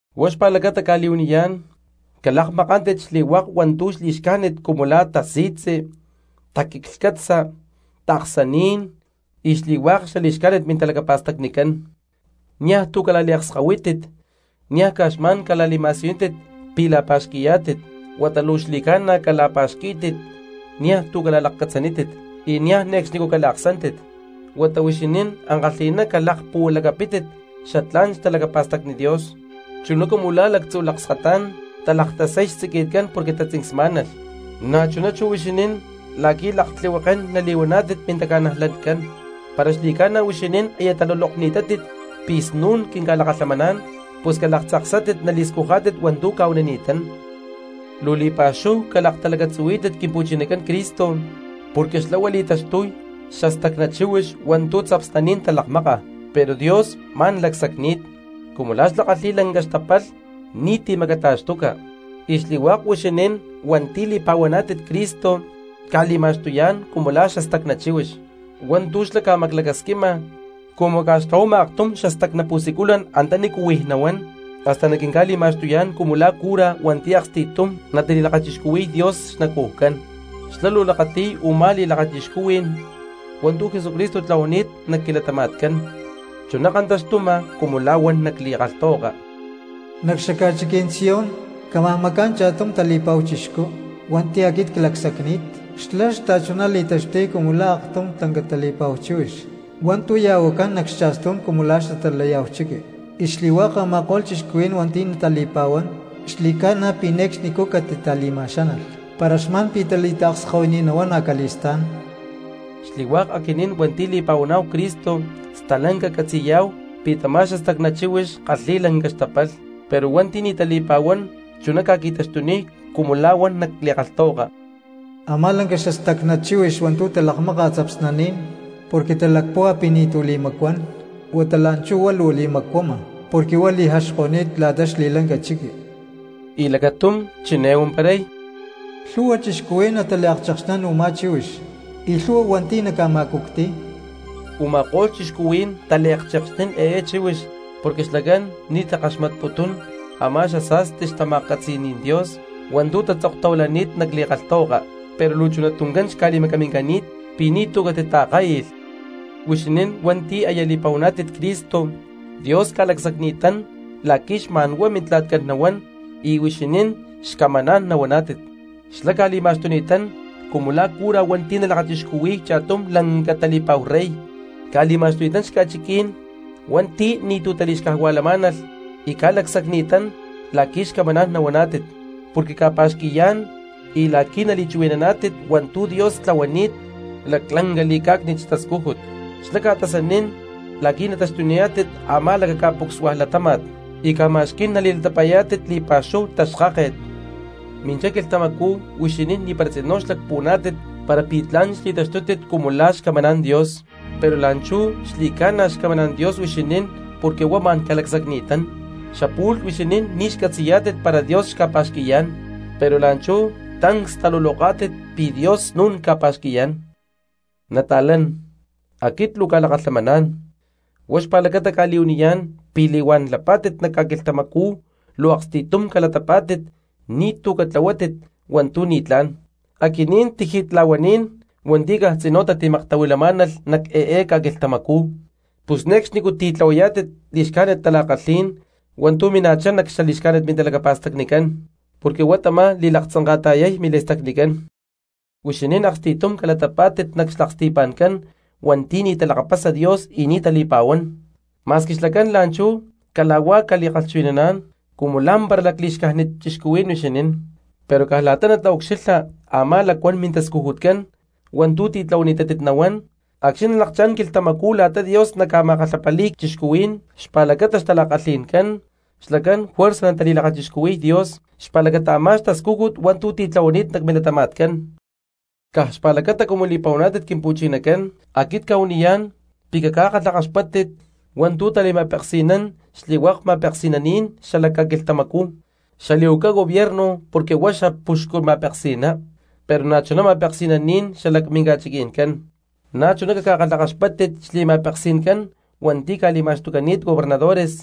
Huá xpa̠lacata cca̠li̠huaniyá̠n, calakmakántit xli̠hua̠k hua̠ntu̠ li̠xcájnit cumu la̠ tasi̠tzi, taquiclhcatza, taaksaní̠n y xli̠hua̠k xali̠xcájnit mintalacapa̠stacnicán, niaj tu̠ cala̠liakskahuítit, niaj caj xma̠n cala̠li̠ma̠siyunítit pi̠ la̠pa̠xqui̠yá̠tit huata luu xaxli̠ca̠na cala̠pa̠xquí̠tit, niaj tu̠ cala̠lakcatzanítit, y niaj ne̠cxnicú cala̠aksántit. Huata huixinín ankalhi̠ná calakpuhualacapítit xatlá̠n xtalacapa̠stacni Dios, chuná cumu la̠ lactzu̠ lakskatá̠n talaktasay xtziqui̠tcán porque tatzincsmá̠nalh, na̠chuná chú huixinín la̠qui̠ laktlihuekén nali̠huaná̠tit mintaca̠najlatcán. Para xli̠ca̠na huixinín aya talulokni̠tátit pi̠ snu̠n quinca̠lakalhamaná̠n, pus calaktzaksátit nali̠scujá̠tit hua̠ntú cca̠huanini̠tán. Luu li̠pa̠xúhu calaktalacatzuhuí̠tit Quimpu̠chinacán Cristo, porque xlá huá li̠taxtuy xastacna chíhuix hua̠ntu̠ tzapsnaní̠n talakmáka, pero Dios ma̠n lacsacni̠t cumu xlá kalhi̠y lanca xtapalh ni̠ti̠ macata̠xtuca. Y xli̠hua̠k huixinín hua̠nti̠ li̠pa̠huaná̠tit Cristo ca̠li̠ma̠xtuyá̠n cumu la̠ xastacná chíhuix hua̠ntu̠ xlá ca̠maclacasquima cumu ca̠xtlahuama aktum xastacná pu̠siculan antanícu huij nahuán, hasta na̠ quinca̠li̠ma̠xtuyá̠n cumu la̠ cura hua̠nti̠ aksti̠tum natali̠lakachixcuhui̠y Dios xnacujcán, xlá luu lakati̠y u̠má li̠lakachixcuhui̠n hua̠ntu̠ Jesucristo tlahuani̠t nac quilatama̠tcán. Chuná kantaxtuma cumu la̠ huan nac li̠kalhtahuaka: Nac xaca̠chiquí̠n Sión cámaj macá̠n cha̠tum tali̠pa̠hu chixcú hua̠nti̠ aquit clacsacni̠t, xlá xta̠chuná li̠taxtuy cumu la̠ aktum lanca tali̠pa̠hu chíhuix hua̠ntu̠ ya̠huacán nac cha̠stú̠n cumu la̠ xatalayá̠hu chiqui; y xli̠hua̠k a̠ma̠ko̠lh cristianos hua̠nti̠ natali̠pa̠huán xli̠ca̠na pi̠ ne̠cxnicú catitali̠ma̠xánalh para xma̠n pi̠ tali̠taakskahuini̠t nahuán acali̠stá̠n. Xli̠hua̠k aquinín hua̠nti̠ li̠pa̠huaná̠hu Cristo stalanca catzi̠yá̠hu pi̠ tamá xastacná chíhuix kalhi̠y lanca xtapalh, pero hua̠nti̠ ni̠ tali̠pa̠huán chuná ca̠qui̠taxtuniy cumu la̠ huan nac li̠kalhtahuaka: Amá lanca xastacná chíhuix hua̠ntu̠ talakmáka tzapsnaní̠n porque talacpúhua pi̠ ni̠tu̠ li̠macuán, huata la̠nchú huá luu li̠macuama porque huá li̠jaxko̠ni̠t la̠ta xli̠lanca chiqui. Y lacatum chiné huamparay: Lhu̠hua cristianos nataliakchekxnín u̠má chíhuix, y lhu̠hua hua̠nti̠ naca̠ma̠cucti̠y. Uma̠kó̠lh cristianos taliakchekxnín eé chíhuix porque xlacán ni̠ takaxmatputún a̠má xasa̠sti xtama̠catzi̠ní̠n Dios hua̠ntú tatzoktahuilani̠t nac li̠kalhtahuaka, pero luu chuná tuncán xca̠li̠macamincani̠t pi̠ ni̠tu̠ catitaakai̠lh. Huixinín hua̠nti̠ aya li̠pa̠huaná̠tit Cristo, Dios ca̠lacsacni̠tán la̠qui̠ xma̠n huá Mintla̠tcán nahuán y huixinín xcamaná̠n nahuaná̠tit; xlá ca̠li̠ma̠xtuni̠tán cumu la̠ cura hua̠nti̠ talakachixcuhui̠y cha̠tum lanca tali̠pa̠hu rey, ca̠li̠ma̠xtuni̠tán xca̠chiquí̠n hua̠nti̠ ni̠tu̠ tali̠xcajua̠lamá̠nalh y ca̠lacsacni̠tán la̠qui̠ xcamaná̠n nahuaná̠tit porque ca̠pa̠xqui̠yá̠n y la̠qui̠ nali̠chuhui̠naná̠tit hua̠ntu̠ Dios tlahuani̠t laclanca li̠cá̠cni̠t xtascújut; xlá ca̠tasanín la̠qui̠ nataxtuniyá̠tit a̠má lacaca̠pucsua latáma̠t y ca̠ma̠xquí̠n nali̠latapa̠yá̠tit li̠pa̠xúhu xtaxkáket. Minchá quilhtamacú huixinín ni̠para tzinú xlacpuhuaná̠tit para pi̠ tla̠n xli̠taxtútit cumu la̠ xcamaná̠n Dios, pero la̠nchú xli̠ca̠na xcamaná̠n Dios huixinín porque huá ma̠n ca̠lacsacni̠tán; xapu̠lh huixinín ni̠ xcatzi̠yá̠tit para Dios xca̠pa̠xqui̠yá̠n pero la̠nchú tancs taluloká̠tit pi̠ Dios snú̠n ca̠pa̠xqui̠yá̠n. Nata̠lán, aquit luu cca̠lakalhamaná̠n, huá xpa̠lacata cca̠li̠huaniyá̠n pi̠ li̠huán lapá̠tit nac ca̠quilhtamacú luu aksti̠tum calatapá̠tit ni̠tu̠ catlahuátit hua̠ntu̠ ni̠tlá̠n, aquinín tiji̠tla̠huaní̠n hua̠nti̠ caj tzinú tatimaktahuilamá̠nalh nac eé ca̠quilhtamacú; pus ne̠cxnicú titlahuayá̠tit li̠xcájnit tala̠kalhí̠n hua̠ntu̠ mina̠chá nac xali̠xcájnit mintalacapa̠stacnicán, porque huá tamá li̠laktzanka̠ta̠yay mili̠stacnicán. Huixinín aksti̠tum calatapá̠tit nac xlaksti̠pa̠ncán hua̠nti̠ ni̠ talakapasa Dios y ni̠ tali̠pa̠huán, ma̠squi xlacán la̠nchú cala̠huá ca̠li̠kalhchuhui̠naná̠n cumu lá̠mpara lacli̠xcájnit cristianos huixinín, pero caj la̠ta nataucxilha a̠má lacuán mintascujutcán hua̠ntu̠ titlahuani̠tátit, nahuán acxni̠ nalakchá̠n quilhtamacú la̠ta Dios naca̠ma̠kalhapali̠y cristianos xpa̠lacata xtala̠kalhi̠ncán, xlacán juerza natali̠lakachixcuhui̠y Dios xpa̠lacata a̠má xtascújut hua̠ntu̠ titlahuani̠t nac milatama̠tcán. Caj xpa̠lacata cumu li̠pa̠huaná̠tit Quimpu̠chinacán, aquit cca̠huaniyá̠n pi̠ caca̠kalhakaxpáttit hua̠ntu̠ tali̠ma̠peksi̠nán xli̠hua̠k ma̠peksi̠naní̠n xalac ca̠quilhtamacú, xali̠huaca gobierno porque huá xapuxcu ma̠peksi̠ná, pero na̠chuná ma̠peksi̠naní̠n xalac minca̠chiqui̠ncán. Na̠chuná caca̠kalhakaxpáttit xli̠ma̠peksi̠ncán hua̠nti̠ ca̠li̠ma̠xtucani̠t gobernadores,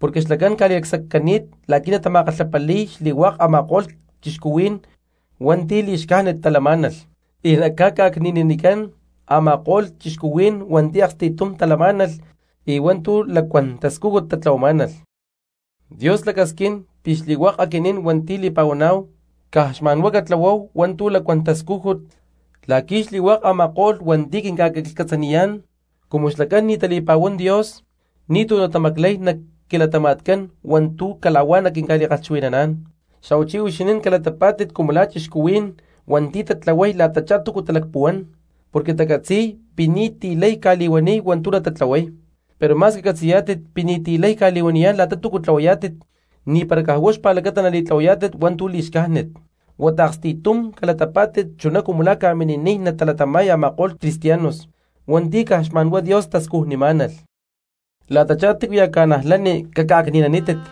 porque xlacán ca̠li̠lacsaccani̠t la̠qui̠ natama̠kalhapali̠y xli̠hua̠k a̠ma̠ko̠lh cristianos hua̠nti̠ li̠xcájnit talamá̠nalh, y naca̠ca̠cni̠nanicán a̠ma̠ko̠lh cristianos hua̠nti̠ aksti̠tum talamá̠nalh y hua̠ntu̠ lacuán tascújut tatlahuamá̠nalh. Dios lacasquín pi̠ xli̠hua̠k aquinín hua̠nti̠ li̠pa̠huaná̠hu caj xma̠n huá catlahuáhu hua̠ntu̠ lacuán tascújut la̠qui̠ xli̠hua̠k a̠ma̠ko̠lh hua̠nti̠ quinca̠quiclhcatzaniyá̠n cumu xlacán ni̠ tali̠pa̠huán Dios ni̠tu̠ natamaclay nac quilatama̠tcán hua̠ntú cala̠huá naquinca̠li̠kalhchuhui̠naná̠n. Xa̠huachí huixinín calatapá̠tit cumu la̠ cristianos hua̠nti̠ tatlahuay la̠tachá túcu talacpuhuán porque tacatzi̠y pi̠ ni̠ti̠ lay ca̠li̠huaniy hua̠ntu̠ natatlahuay, pero ma̠squi catzi̠yá̠tit pi̠ ni̠ti̠ lay ca̠li̠huaniyá̠n la̠ta tú tlahuayá̠tit ni̠para caj huá xpa̠lacata nali̠tlahuayá̠tit hua̠ntú li̠xcájnit. Huata aksti̠tum calatapa̠tit chuná cumu la̠ ca̠mini̠niy natalatama̠y a̠ma̠ko̠lh cristianos hua̠nti̠ caj xma̠n huá Dios tascujnimá̠nalh. La̠tachá tícuya̠ cristianos caca̠ca̠cni̠nanítit,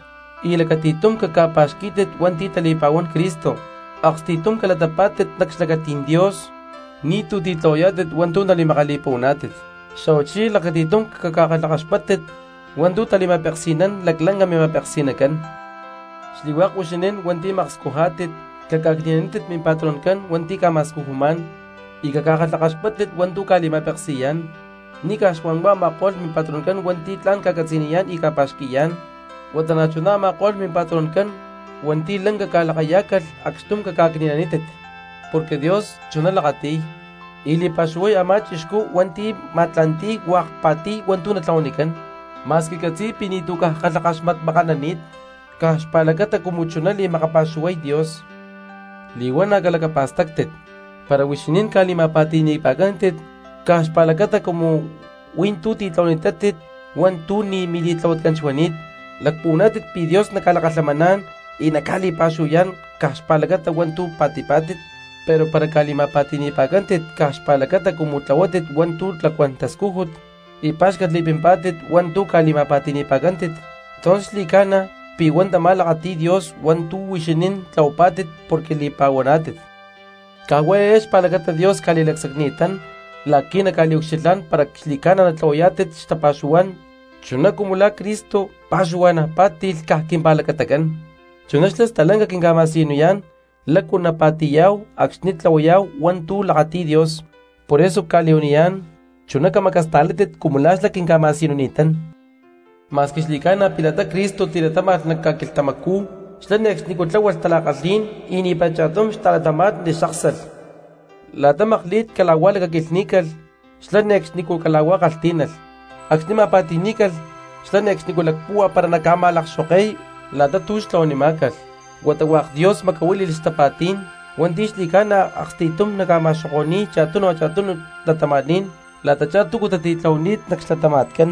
y lacati̠tum caca̠pa̠xquí̠tit hua̠nti̠ tali̠pa̠huán Cristo, aksti̠tum calatapá̠tit nac xlacatí̠n Dios ni̠tu̠ titlahuayá̠tit hua̠ntú nali̠makali̠puhuaná̠tit, xa̠huachí lacati̠tum caca̠kalhakaxpátit hua̠ntu̠ tali̠ma̠peksi̠nán laclanca mima̠peksi̠nacán. Xli̠hua̠k huixinín hua̠nti̠ makscujá̠tit caca̠ca̠cni̠nanítit mimpatroncán hua̠nti̠ ca̠ma̠scujumá̠n y caca̠kalhakaxpáttit hua̠ntu̠ ca̠li̠ma̠peksi̠yá̠n, ni̠ caj xma̠nhuá a̠ma̠ko̠lh mimpatroncán hua̠nti̠ tla̠n ca̠catzi̠niyá̠n y ca̠pa̠xqui̠yá̠n, huata na̠chuná a̠ma̠ko̠lh mimpatroncán hua̠nti̠ lanca ca̠lakayá̠calh, acxtum caca̠cni̠nanítit. Porque Dios chuná lakati̠y, y li̠pa̠xuhuay a̠má cristiano hua̠nti̠ ma̠tla̠nti̠y hua̠k pa̠ti̠y hua̠ntu̠ natlahuanicán, ma̠squi catzi̠y pi̠ ni̠tu̠ caj kalhakaxmatmakanani̠t, caj xpa̠lacata cumu chuná li̠makapa̠xuhuay Dios. Li̠huana̠ calacapa̠stáctit: para huixinín ca̠li̠ma̠pa̠ti̠ni̠pa̠cántit caj xpa̠lacata cumu hui̠ntú tlahuani̠tátit hua̠ntu̠ ni̠ mili̠tlahuatcán xuani̠t, ¿lacpuhuaná̠tit pi̠ Dios naca̠lakalhamaná̠n y naca̠li̠pa̠xuhuayá̠n caj xpa̠lacata hua̠ntu̠ pa̠ti̠pá̠tit? Pero para ca̠li̠ma̠pa̠ti̠ni̠pa̠cántit caj xpa̠lacata cumu tlahuapá̠tit hua̠ntu̠ lacuán tascújut y pa̠xcatli̠pimpá̠tit hua̠ntú ca̠ma̠pa̠ti̠ni̠pa̠cántit, entonces xli̠ca̠na pi̠ hua̠ntamá lakati̠y Dios hua̠ntu̠ huixinín tlahuapá̠tit porque li̠pa̠huaná̠tit. Caj huá eé xpa̠lacata Dios ca̠li̠lacsacni̠tán la̠qui̠ naca̠liucxilhá̠n para xli̠ca̠na natlahuayá̠tit xtapa̠xuhuá̠n chuná cumu la̠ Cristo pa̠xuhua̠na̠ pá̠ti̠lh caj quimpa̠lacatacán, chuná xlá stalanca quinca̠ma̠siyunini̠tán lácu napa̠ti̠yá̠hu acxni̠ tlahuayá̠hu hua̠ntu̠ lakati̠y Dios, poreso cca̠li̠huaniyá̠n: chuná camacasta̠látit cumu la̠ xlá quinca̠ma̠siyunini̠tán. Ma̠squi xli̠ca̠na pi̠ la̠ta Cristo tilatáma̠lh nac ca̠quilhtamacú, xlá ne̠cxnicú tláhualh tala̠kalhí̠n y ni̠para cha̠tum xta̠cristianos xáksalh. La̠ta makli̠t cala̠huá lacaquilhní̠calh xlá ne̠cxnicú cala̠huá kalhtí̠nalh; acxni̠ ma̠pa̠ti̠ní̠calh xlá ne̠cxnicú lacpúhua para naca̠ma̠lakxoke̠y la̠ta tú xtlahuanimá̠calh, huata hua̠k Dios xmacahuili̠y xtapa̠tí̠n hua̠nti̠ xli̠ca̠na aksti̠tum naca̠ma̠xoko̠ni̠y cha̠tunu cha̠tunu cristianos la̠tachá túcu tatitlahuani̠t nac xlatama̠tcán.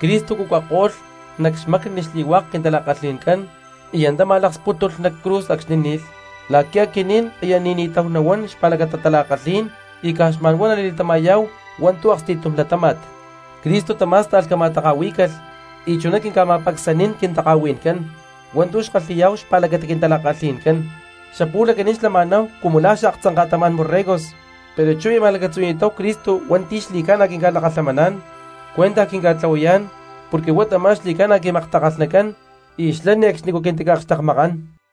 Cristo cucako̠lh nac xmacni xli̠hua̠k quintala̠kalhi̠ncán y antá ma̠lakspútulh nac cruz acxni̠ ni̠lh, la̠qui̠ aquinín aya ni̠ni̠táhu nahuán xpa̠lacata tala̠kalhí̠n y caj xma̠nhuá nali̠latama̠yá̠hu hua̠ntu̠ aksti̠tum latáma̠t. Cristo tamá̠sta̠lh cama̠taka̠huí̠calh y chuná quinca̠ma̠pacsanín quintaka̠hui̠ncán hua̠ntu̠ xkalhi̠yá̠hu xpa̠lacata quintala̠kalhi̠ncán. Xapu̠lh aquinín xlama̠náhu cumu la̠ xaaktzanka̠tamá̠n borregos, pero chú aya ma̠lacatzuhui̠ni̠táhu Cristo hua̠nti̠ xli̠ca̠na quinca̠lakalhamaná̠n cuentaj quinca̠tlahuayá̠n porque huá tamá xaxli̠ca̠na quimaktakalhnacán y xlá ne̠cxnicú caquintica̠akxtekmakán.